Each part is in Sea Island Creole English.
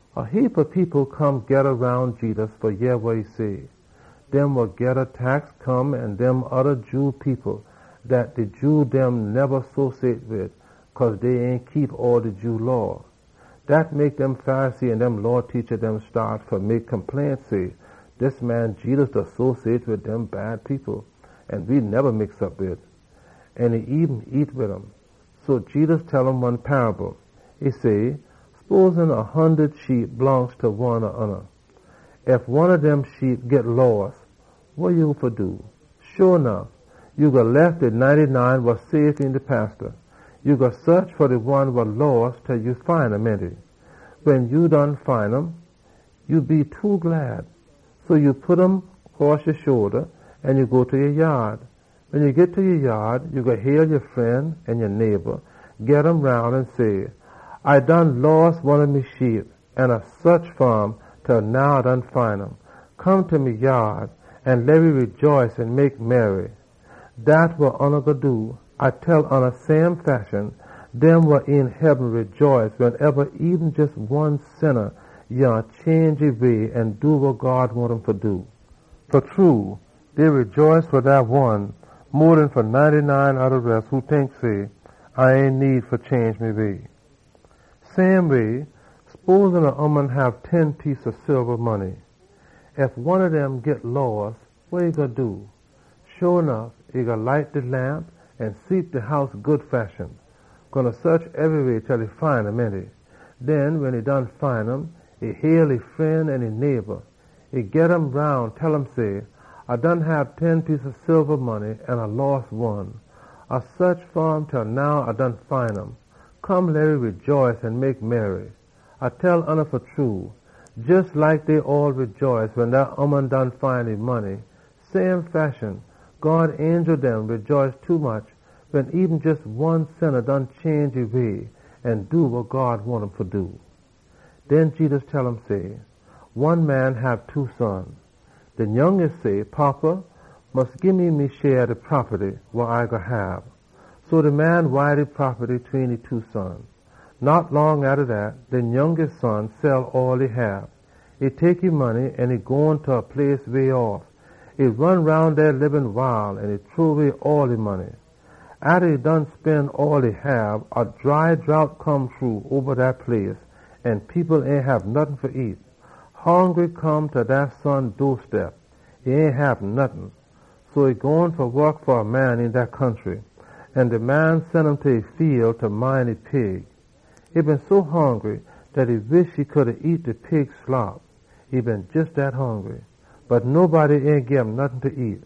A heapa people come geda roun Jedus fa yeh wa e say. Dem wa geda tax come an dem oda Jew people dat de Jew dem ain neba mix op wid cause dey ain keep all de Jew Law. Dat mek de Pharisee dem an de Law teacha dem staat fa mek chaage say, “Dis man Jedus da mix op wid bad people, an e eben da nyam wid um!” So Jedus tell um one paable. E say, “Sposin a hundud sheep blongst ta one ob oona. Ef one ob dem sheep git loss, wa ya fa do? Sho nuff, ya gwine lef de ninety-nine wa safe een de fiel, an ya gwine saach fa de one wa loss til ya find um, ainty? Wen ya done find um, ya gwine be too glad, so ya gwine pit um cross ya shoulda. Wen ya git home, ya gwine hail ya fren dem an ya neighba dem, geda um roun an say, ‘A been loss one ob me sheep, an A saach fa um til now A done find um. Come, we gwine rejaice an mek merry!’ A da tell oona, same fashion, dem wa een heaben rejaice wensoneba eben jes one sinna change e way an do wa God wahn um fa do. Fa true, dey gwine rejaice fa dat one mo den fa ninety-nine oda res wa tink say dey ain haffa change dey way. “Same way, sposin a ooman hab ten piece ob silba money. Ef one ob dem git loss, wa e gwine do? Sho nuff e gwine light de lamp an sweep de house good fashion. E gwine saach ebryweh til e find um, ainty? Den, wen e done find um, e gwine hail e fren an neighba dem. E gwine tell um say, ‘A been hab ten piece ob silba money an A loss one. A saach fa um til now A done find um. Come, we gwine rejaice an mek merry!’ A da tell oona fa true, jes like dey all rejaice wen dat ooman find e money, same fashion, God angel dem da rejaice tommuch wen eben jes one sinna change e sinful way an do wa God wahn um fa do.” Den Jedus tell um say, “One man been hab two son. De nyounga son say, ‘Fada, mus gii me me share ob de propaty wa A spose fa hab.’ So de man wide op e propaty tween e two son dem. Ain long atta dat, de nyounga son sell all e hab. E tek e money an e gone ta a place way off. E ron roun dey da lib loose life, an e shrow way all e money. Atta e done spen all e hab, a dry drought come shru oba all dat place an de people ain hab nottin fa nyam. Hongry come ta dat son doorstep. E ain hab nottin. So e gone fa wok fa a man een dat country, an de man sen um ta e fiel fa mind de pig dem. E been so hongry dat e been wahn fa nyam de pig slop. Bot nobody ain gim nottin fa nyam.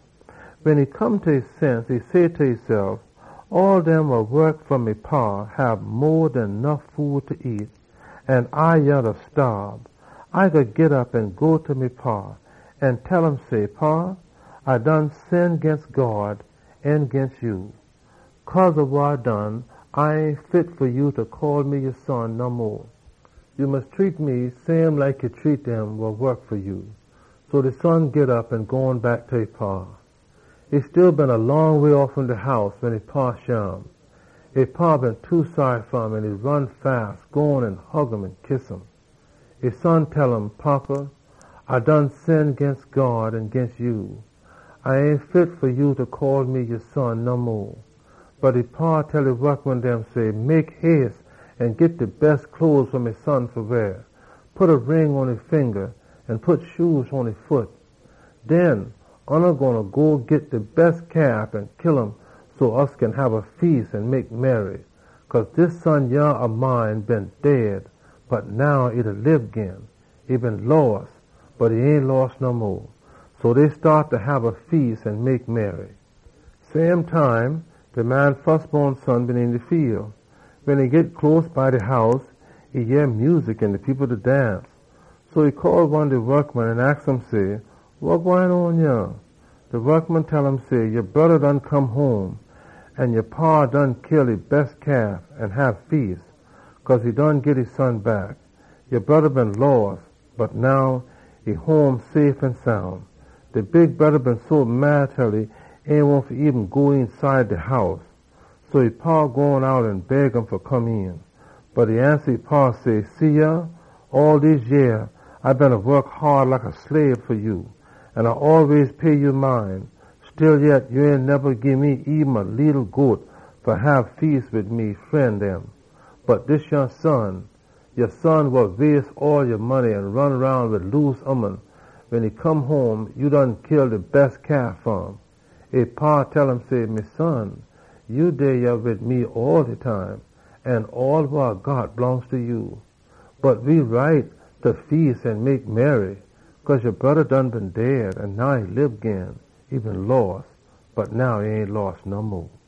Wen e come ta e sense, e say ta esef, ‘All dem wa wok fa me fada hab mo den nuff food fa nyam, an A yah da staab! A gwine git op an go ta me fada an tell um say, “Fada, A done sin ginst God an ginst ya. Cause ob wa A done, A ain fit fa ya fa call me ya son no mo. Ya mus treat me same like ya da treat ya wokman dem.” ’ So de son git op, an e gone back ta e fada. “E still been a long way off fom de house wen e fada shim. E fada been too saary fa um, an e ron quick, gone an hug an kiss um. E son tell um, ‘Fada, A done sin ginst God an ginst ya. A ain fit fa ya fa call me ya son no mo.’ Bot e fada tell e wokman dem say, ‘Mek hace an git de bes cloes fa me son fa weah. Pit a ring pon e finga, an pit shoe pon e foot. Den, oona gwine go git de bes calf an kill um so we kin hab a feas an mek merry. Cause dis son yah ob mine been dead, bot now e da lib gin. E been loss, bot we done find um.’ So dey staat fa hab a feas an mek merry. “Same time, de man fusbon son been een de fiel. Wen e git close ta de house, e yeh music an de people da dance. So e call one de wokman an aks um say, ‘Wa gwine on yah?’ De wokman tell um say, ‘Ya broda done come home, an ya fada kill e bes calf an hab feas, cause e been git e son back. Ya broda been loss, bot now e home safe an soun.’ De big broda been so mad til e ain wahn eben fa go eenside de house. So e fada gone out an beg um fa come een. Bot e ansa e fada say, ‘See yah, all dese yeah A beena wok haad like a slabe fa ya, an A da pay ya mind all de time. Stillyet, ya ain neba gii me eben a leetle goat fa hab feas wid me fren dem. Bot dis yah son, ya son wa waste all ya money an ron roun wid loose ooman, wen e come home, ya kill de bes calf fa um!’ E fada tell um say, ‘Me son, ya dey yah wid me all de time, an all wa A got blongst ta ya. Bot we right fa feas an mek merry, cause ya broda done been dead, an now e da lib gin. E been loss, bot we done find um.’”